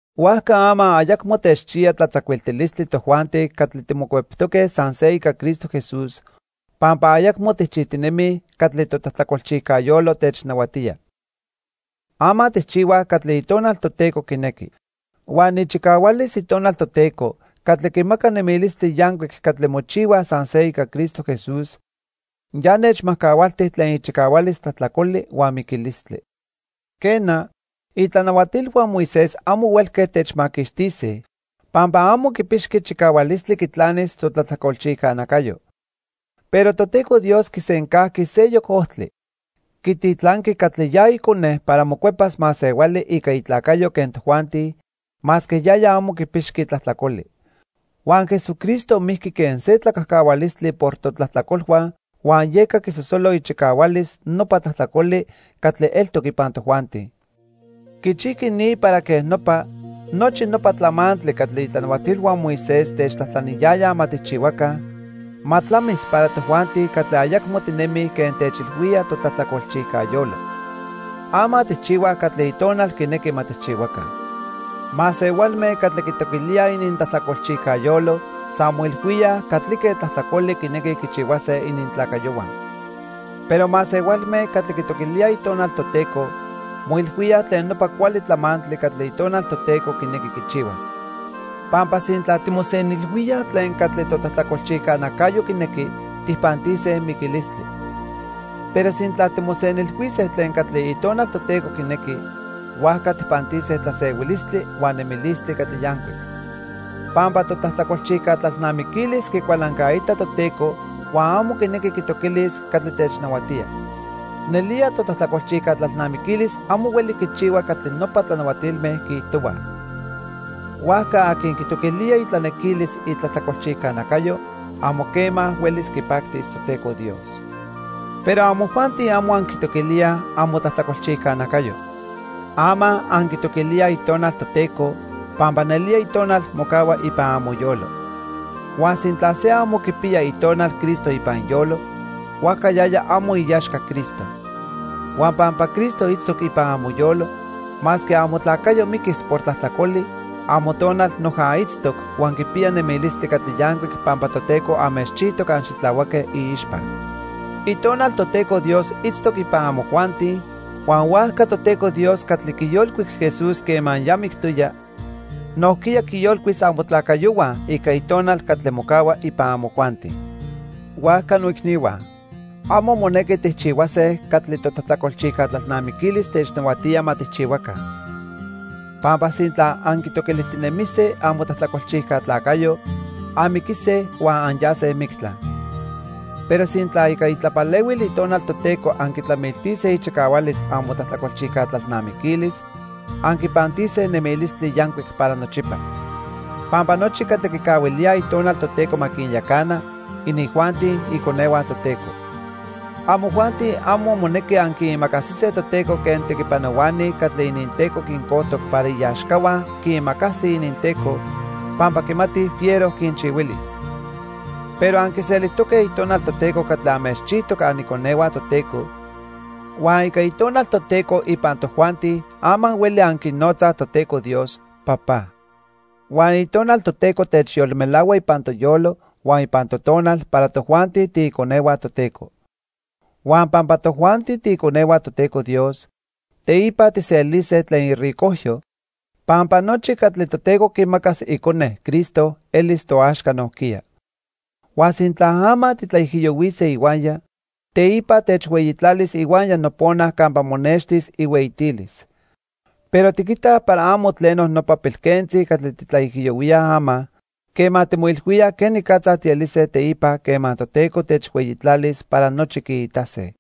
Huajca ama ayacmo techchiya tlatzacuiltilistli tojuanti catli timocueptoque san se ica Cristo Jesús, pampa ayacmo tijchijtinemij catli totlajtlacolchijca yolo technahuatía. Ama tijchihuaj catli Itonal Toteco quinequi. Huan ichicahualis Itonal Toteco, catli quimaca nemilistli yancuic catli mochihuaj san se ica Cristo Jesús, ya nechmajcahualti tlen ichicahualis tlajtlacoli huan miquilistli. Quena, itlanahuatilhua Moisés amo huelque techmaquixtise, pampa amo quipixqui chicahualistli quitlanis totlajtlacolchijca nacayo. Pero Toteco Dios quisencajqui seyoc ojtli. Quititlanqui catli ya Icone para mocuepas masehuali ica itlacayo quen tojuanti, masque yaya amo quipixqui tlajtlacoli. Huan Jesucristo mijqui quen se tlacajcahualistli por totlajtlacolhua huan yeca quisosolo ichicahualis nopa tlajtlacoli catli eltoc ipan tojuanti. Quichijqui ni para quej nopa, nochi nopa tlamantli catli itlanahuatilhua Moisés techtlajtlaniyayaj ma tijchihuaca, ma tlamis para tojuanti catli ayacmo tinemij quen techilhuía totlajtlacolchijca yolo. Ama tijchihuaj catli Itonal quinequi ma tijchihuaca. Masehualme catli quitoquilíaj inintlajtlacolchijca yolo san moilhuíaj catlique tlajtlacoli quinequij quichihuase inintlacayohua. Pero masehualme catli quitoquilíaj Itonal Toteco moilhuíaj tlen nopa cuali tlamantli catli Itonal Toteco quinequi quichihuas. Pampa sintla timosenilhuíaj tlen catli totlajtlacolchijca nacayo quinequi, tijpantise miquilistli. Pero sintla timosenilhuise tlen catli Itonal Toteco quinequi, huajca tijpantise tlasehuilistli huan nemilistli catli yancuic. Pampa totlajtlacolchijca tlalnamiquilis quicualancaita Toteco huan amo quinequi quitoquilis catli technahuatía. Nelía totlajtlacolchijca tlalnamiquilis amo hueli quichihua catli nopa tlanahuatilme quiijtohuaj. Huajca aqui quitoquilía itlanequilis itlajtlacolchijca nacayo, amo quema huelis quipactis Toteco Dios. Pero amojuanti amo anquitoquilíaj amotlajtlacolchijca nacayo. Ama anquitoquilíaj Itonal Toteco, pampa nelía Itonal mocahua ipan amoyolo. Huan sintla se amo quipiya Itonal Cristo ipan iyolo, huajca yaya amo iaxca Cristo. Huan pampa Cristo itztoc ipan amoyolo, masque amotlacayo miquis por tlajtlacoli, amotonal noja itztoc huan quipiya nemilistli catli yancuic pampa Toteco anmechchijtoc anxitlahuaque iixpa. Itonal Toteco Dios itztoc ipan amojuanti, huan huajca Toteco Dios catli quiyolcuic Jesús quema ya mictoya, nojquiya quiyolcuis amotlacayohua ica Itonal catli mocahua ipan amojuanti. Huajca noicnihua, amo monequi tijchihuase catli totlajtlacolchijca tlalnamiquilis technahuatía ma tijchihuaca. Pampa sintla anquitoquilijtinemise amotlajtlacolchijca tlacayo, anmiquise huan anyase mictla. Pero sintla ica itlapalehuil Itonal Toteco anquitlamiltise ichicahualis amotlajtlacolchijca tlalnamiquilis, anquipantise nemilistli yancuic para nochipa. Pampa nochi catli quicahuilíaj Itonal Toteco ma quinyacana, inijuanti iconehua Toteco. Amojuanti amo monequi anquiimacasise Toteco quen tequipanohuani catli ininteco quincojtoc para iaxcahua quiimacasij ininteco pampa quimatij fiero quinchihuilis. Pero anquiselijtoque Itonal Toteco catli anmechchijtoc aniconehua Toteco, huan ica Itonal Toteco ipan tojuanti ama hueli anquinotzaj Toteco Dios: "Papá." Huan Itonal Toteco techyolmelahua ipan toyolo huan ipan totonal para tojuanti tiiconehua Toteco. Huan pampa tojuanti tiiconehua Toteco Dios, teipa tijselise tlen iricojyo, pampa nochi catli Toteco quimacas Icone, Cristo, elis toaxca nojquiya. Huan sintla ama titlaijiyohuise ihuaya, teipa techhueyitlalis ihuaya nopona campa monextis ihueyitilis. Pero tiquitaj para amo tleno nopa pilquentzi catli titlaijiyohuíaj ama, quema timoilhuíaj quenicatza tielise teipa quema Toteco techhueyitlalis para nochi quiitase.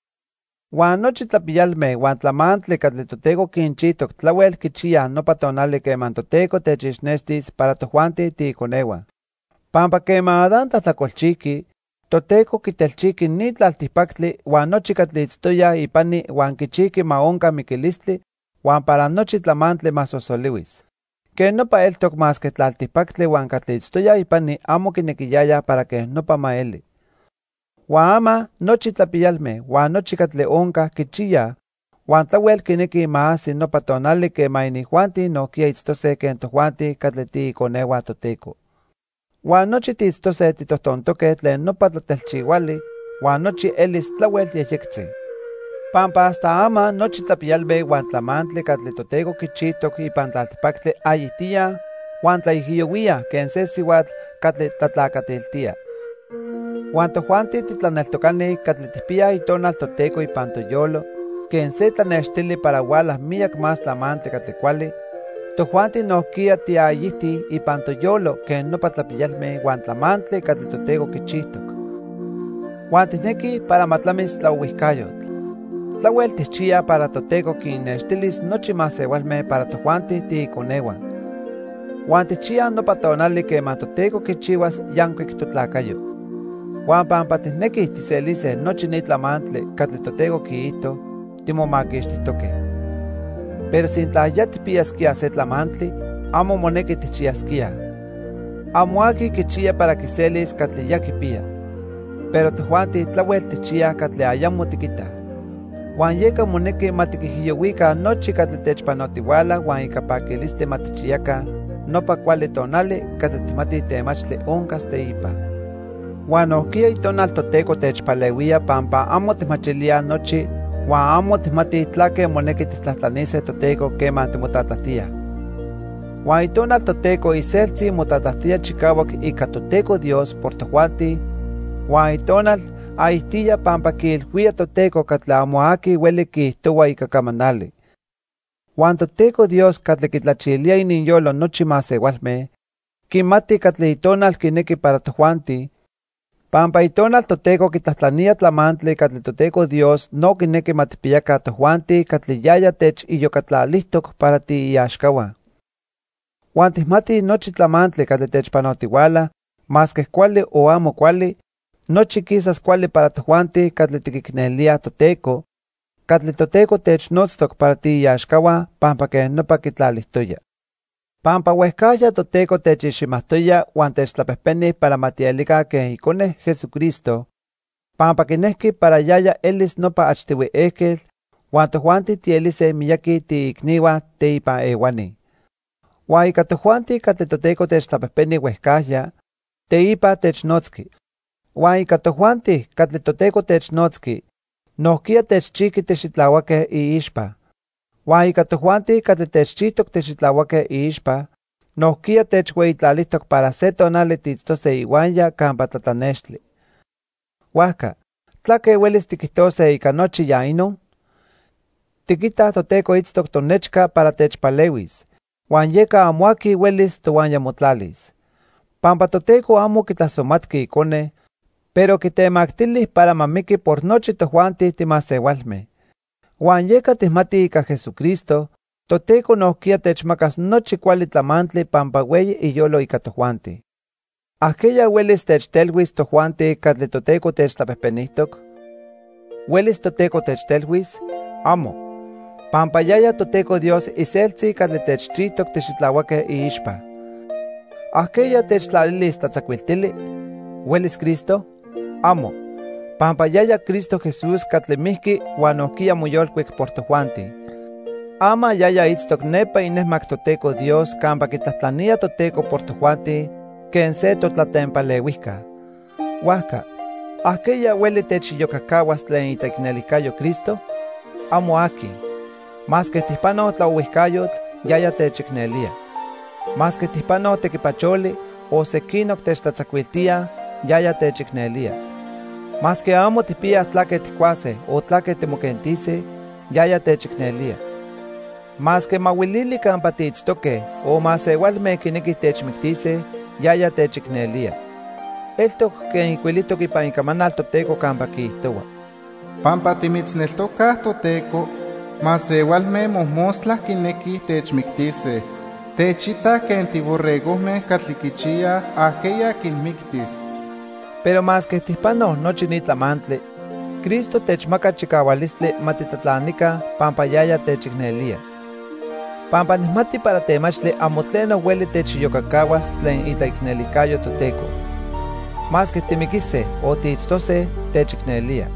Huan nochi tlapiyalme huan tlamantli catli Toteco quinchijtoc tlahuel quichiyaj nopa tonali quema Toteco techixnextis para tojuanti tiiconehua. Pampa quema Adán tlajtlacolchijqui, Toteco quitelchijqui ni tlaltipactli huan nochi catli itztoyaj ipani huan quichijqui ma onca miquilistli huan para nochi tlamantli ma sosolihuis. Quej nopa eltoc masque tlaltipactli huan catli itztoyaj ipani amo quinequiyayaj para quej nopa ma eli. Huan ama nochi tlapiyalme huan nochi catli onca quichiyaj, huan tlahuel quinequij ma ajsi nopa tonali quema inijuanti nojquiya itztose quen tojuanti catli tiiconehua Toteco. Huan nochi tiitztose titojtontoque tlen nopa tlatelchihuali, huan nochi elis tlahuel yejyectzi. Pampa hasta ama nochi tlapiyalme huan tlamantli catli Toteco quichijtoc ipan tlaltipactli ayijtíaj huan tlaijiyohuíaj quen se sihuatl catli tlatlacatiltía. Huan tojuanti titlaneltocani catli tijpiyaj Itonal Toteco ipan toyolo quen se tlanextili para huala miyac más tlamantli catli cuali, tojuanti nojquiya tiayijtij ipan toyolo quen nopa tlapiyalme huan tlamantli catli Toteco quichijtoc. Huan tijnequij para ma tlamis tlaohuijcayotl. Tlahuel tijchiyaj para Toteco quinnextilis nochi masehualme para tojuanti tiiconehua. Huan tijchiyaj nopa tonali quema Toteco quichihuas yancuic totlacayo. Huan pampa tijnequij tijselise nochi ni tlamantli catli Toteco quiijto, timomaquixtijtoque. Pero sintla ya tijpiyasquíaj se tlamantli, amo monequi tijchiyasquíaj. Amo aqui quichiya para quiselis catli ya quipiya. Pero tojuanti tlahuel tijchiyaj catli ayamo tiquitaj. Huan yeca monequi ma tiquijiyohuica nochi catli techpanotihuala huan ica paquilistli ma tijchiyaca nopa cuali tonali catli tijmatij temachtli oncas teipa. Huan nojquiya Itonal Toteco techpalehuía pampa amo tijmachilíaj nochi huan amo tijmatij tlaque monequi tijtlajtlanise Toteco quema timotlatlajtíaj. Huan Itonal Toteco iseltzi motlatlajtía chicahuac ica Toteco Dios por tojuanti huan Itonal ayijtía pampa quiilhuía Toteco catli amo aqui hueli quiijtohua ica camanali. Huan Toteco Dios catli quitlachilía ininyolo nochi masehualme, quimati catli Itonal quinequi para tojuanti, pampa Itonal Toteco quitlajtlanía tlamantli catli Toteco Dios no quinequi ma tijpiyaca tojuanti catli yaya techiyocatlalijtoc para tiiaxcahua. Huan tijmatij nochi tlamantli catli techpanotihuala, masque cuali o amo cuali, nochi quisas cuali para tojuanti catli tiquicnelíaj Toteco, catli Toteco technotztoc para tiiaxcahua pampa quej nopa quitlalijtoya. Pampa huejcajya Toteco techiximajtoya huan techtlapejpeni para ma tielica quen Icone, Jesucristo, pampa quinejqui para yaya elis nopa achtihui ejquetl huan tojuanti tielise miyaqui tiiicnihua teipan ehuani. Huan ica tojuanti catli Toteco techtlapejpeni huejcajya, teipa technotzqui. Huan ica tojuanti catli Toteco technotzqui, nojquiya techchijqui tixitlahuaque iixpa. Huan ica tojuanti catli techchijtoc tixitlahuaque iixpa, nojquiya techhueyitlalijtoc para se tonali tiitztose ihuaya campa tlatlanextli. Huajca ¿tlaque huelis tiquijtose ica nochi ya inon? Tiquitaj Toteco itztoc tonechca para techpalehuis, huan yeca amo aqui huelis tohuaya motlalis. Pampa Toteco amo quitlasomatqui Icone, pero quitemactili para ma miqui por nochi tojuanti timasehualme. Huan yeca tijmatij ica Jesucristo, Toteco nojquiya techmacas nochi cuali tlamantli pampa hueyi iyolo ica tojuanti. ¿Ajqueya huelis techtelhuis tojuanti catli Toteco techtlapejpenijtoc? ¿Huelis Toteco techtelhuis? ¡Amo! Pampa yaya Toteco Dios iseltzi catli techchijtoc tixitlahuaque iixpa. ¿Ajqueya techtlalilis tlatzacuiltili? ¿Huelis Cristo? ¡Amo! Pampa yaya Cristo Jesús catli mijqui huan nojquiya moyolcuic por tojuanti. Ama yaya itztoc nepa inejmac Toteco Dios campa quitlajtlanía Toteco por tojuanti quen se totlatempalehuijca. Huajca ¿ajqueya hueli techiyocacahuas tlen itlaicnelijcayo Cristo? ¡Amo aqui! Masque tijpanoj tlaohuijcayotl, yaya techicnelía. Masque tijpanoj tequipacholi, o sequinoc techtlatzacuiltíaj, yaya techicnelía. Masque amo tijpiyaj tlaque tijcuase o tlaque timoquentise, yaya techicnelía. Masque mahuilili campa tiitztoque o masehualme quinequij techmictise, yaya techicnelía. Eltoc quen ijcuilijtoc ipan Icamanal Toteco campa quiijtohua: "Pampa timitzneltocaj, Toteco, masehualme mojmostla quinequij techmictise. Techitaj quen tiborregojme catli quichiyaj ajqueya quinmictis." Pero masque tijpanoj nochi ni tlamantli, Cristo techmaca chicahualistli ma titlatlanica pampa yaya techicnelía. Pampa nijmati para temachtli amo tleno hueli techiyocacahuas tlen itlaicnelijcayo Toteco. Masque timiquise o tiitztose, techicnelía.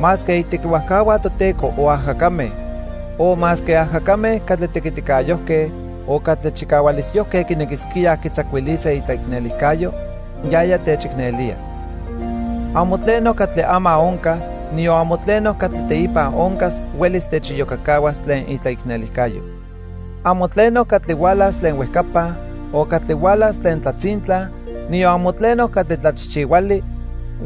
Masque itequihuajcahua Toteco, o ajacame, o masque ajacame catli tequiticayojque o catli chicahualisyojque quinequisquíaj quitzacuilise itlaicnelijcayo, yaya techicnelía. Amo tleno catli ama onca, niyon amo tleno catli teipa oncas huelis techiyocacahuas tlen itlaicnelijcayo. Amo tleno catli hualas tlen huejcapa, o catli hualas tlen tlatzintla, niyon amo tleno catli tlachijchihuali,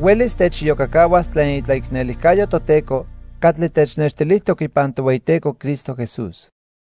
huelis techiyocacahuas tlen itlaicnelijcayo Toteco catli technextilijtoc ipan Tohueyiteco Cristo Jesús.